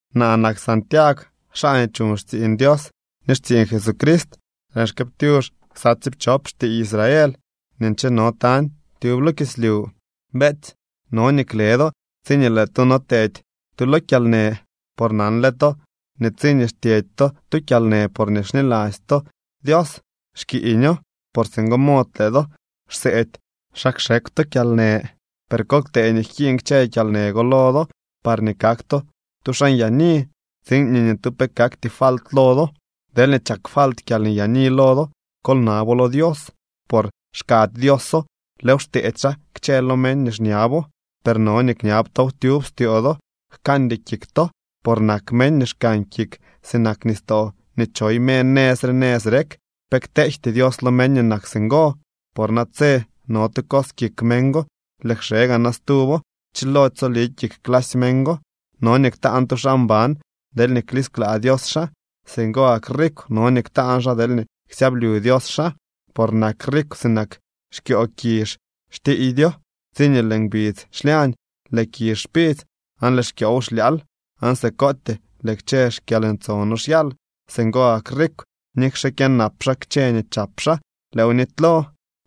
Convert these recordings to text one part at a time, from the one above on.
Naa nak Santiagw, xaa nii chuñ xtsiiñ Dios ni xtsiiñ Jesucrist. Lëën xkëëptyux ksa tsiipchop xtiiy Israel nii ncheno tañ tyub lo kislyu. Beetsy, no nii kle do tsiñee lëë do no tedy tu lo kyalnë. Por nanle to nii tsiñee xtyedy to tu kyalnë porñee xniladzy to Dios, xkiiño. Por singo mod lëë do xseedy xa kxekw to kyalnë. Per kol ktee nii jkiiñ kchë kyalnë go lo do, parñee kak to tu xaa nyaani, tsiin nii ni tu pe kakty falt lo do. Deelñee chak falt kyalnyaani lo do, kol nabo lo Dios por xkady Dioso, lëëw xteedy xaa kchë lo meñ nii xñabo. Per no nii kñab tow tyub styoo do, jkandy kik to, por nak meñ nii xkan kik sinak nistoo nii choy me nëz re nëz rek. Pe kteejty Dios lo meñ nii nak singo, por natse no tu cos kik meñ go, lëë kxe gaa na stuwo, chilody tsoli kik clasy meñ go. No nii ktaan tu xaa mban deelñee klisklaa Dios xaa. Singo gak rikw no nii ktaan xaa deelñee ksyablyu Dios xaa. Por nak rikw sinak xkyoo kizh, xtiiydyo. Tsiñee lëë ngbidz xlyañ, lëë kizh xpidzy aan lëë xkyoow xlyaal. Aan sikootyee lëë kchë xkyalntsono xyal. Singo gak rikw nikxe kyënap xaa kchë nii chap xaa, lëëw nitylo.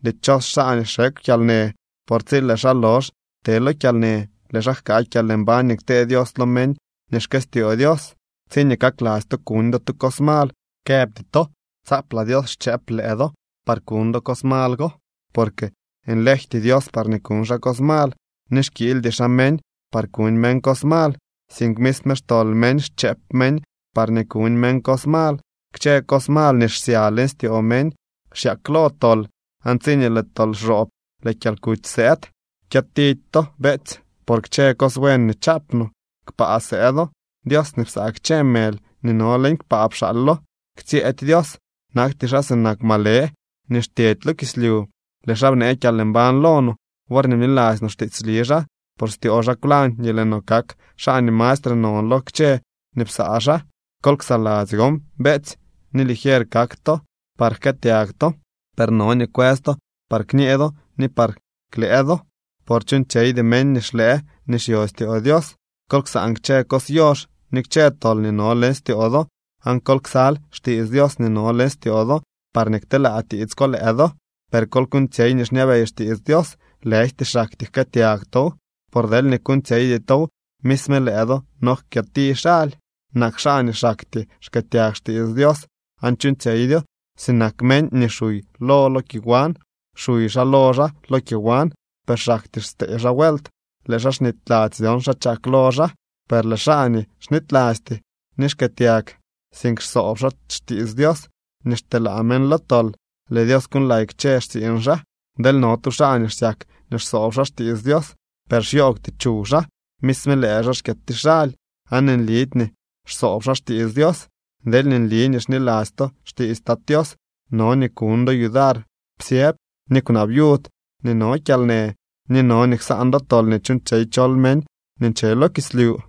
Dichos xaa nii xekw kyalnë, por tsi lëë xaa lox te lo kyalnë, lëë xaa jkaa kyalmbañ nii ktee Dios lo meñ nii xkëstyoo Dios. Tsiñee kakladzy to kuñ do tu cos mal, këbty to tsaaplaa Dios xchëëp lëë do par kuñ do cos mal go. Porque nlejty Dios parñee kuñ xaa cos mal, ni xkiildy xaa meñ par kuñ meñ cos mal. Sink misme xtol meñ xchëp meñ parñee kuñ meñ cos mal. Kchë cos mal nii xsya leñ styoo meñ xyaklo tol, aan tsiñee lëë tol xroob lëë kyalkuty sëëd. Kyëtidy to, beetsy, por kchë cos buen nii chaap no, kpaa sëëdo. Dios nii psaa kchë mëly nii no leñ kpaa pxaalo. Ktsyëëdy Dios. Nakty xaa sinak malë nii xtyedy lo kislyu. Lëë xaa bnee kyalmbañ lo no, worñee bniladzy no xtiitsli xaa. Por styoo xaa kwlañ nii lëë no kak xaa nii mastre non lo kchë nii psaa xaa. Kol ksaladzy gon, beetsy, nii ligier kak to, par jkëëtyag to, per no nii kwës to par kñee do ni par klëë do. Por chuuñtsyeydy meñ nii xlëë nii xyo styoo Dios. Kol ksaan kchë cos yox ni kchë tol nii no leñ styoo do aan kol ksal xtiits Dios nii no leñ styoo do, parñee kteelaa tiits ko lëë do. Per kol kuuñtsyey nii xñabey xtiits Dios, lëjty xaktyee jkëëtyag tow, por deelñee kuuñtsyeydy tow misme lëë do no kyëti xaly. Nak xaa nii xaktyee xkëëtyag xtiits Dios, aan chuuñtsyeydyo, sinak meñ nii xuy lo lo kyowan. Xuy xaa lo xaa lo kyowan, per xaktyee stee xaa vuelt lëë xaa xnityladzy dyon xa chak lo xaa. Per lëë xaa nii xnitylasty nii xkëëtyag, sink xsoob xaa xtiits Dios nii xteelaa meñ lo tol, lëë Dios kuuñlay kchë xtsiiñ xaa. Deel no tu xaa nii xsyak nii xsoob xaa xtiits Dios, per xyoogwty chuw xaa, misme lëë xaa xkyëti xaly aan nlidy nii xsoob xaa xtiits Dios. Deelñee nli nii xniladzy to xtiits Tat Tios no nii kuñ do yudar psyëb ni kwnaa viud nii no kyalnë, ni no nii ksaan do tol nii chuuñtsyey chol meñ nii nche lo kislyu.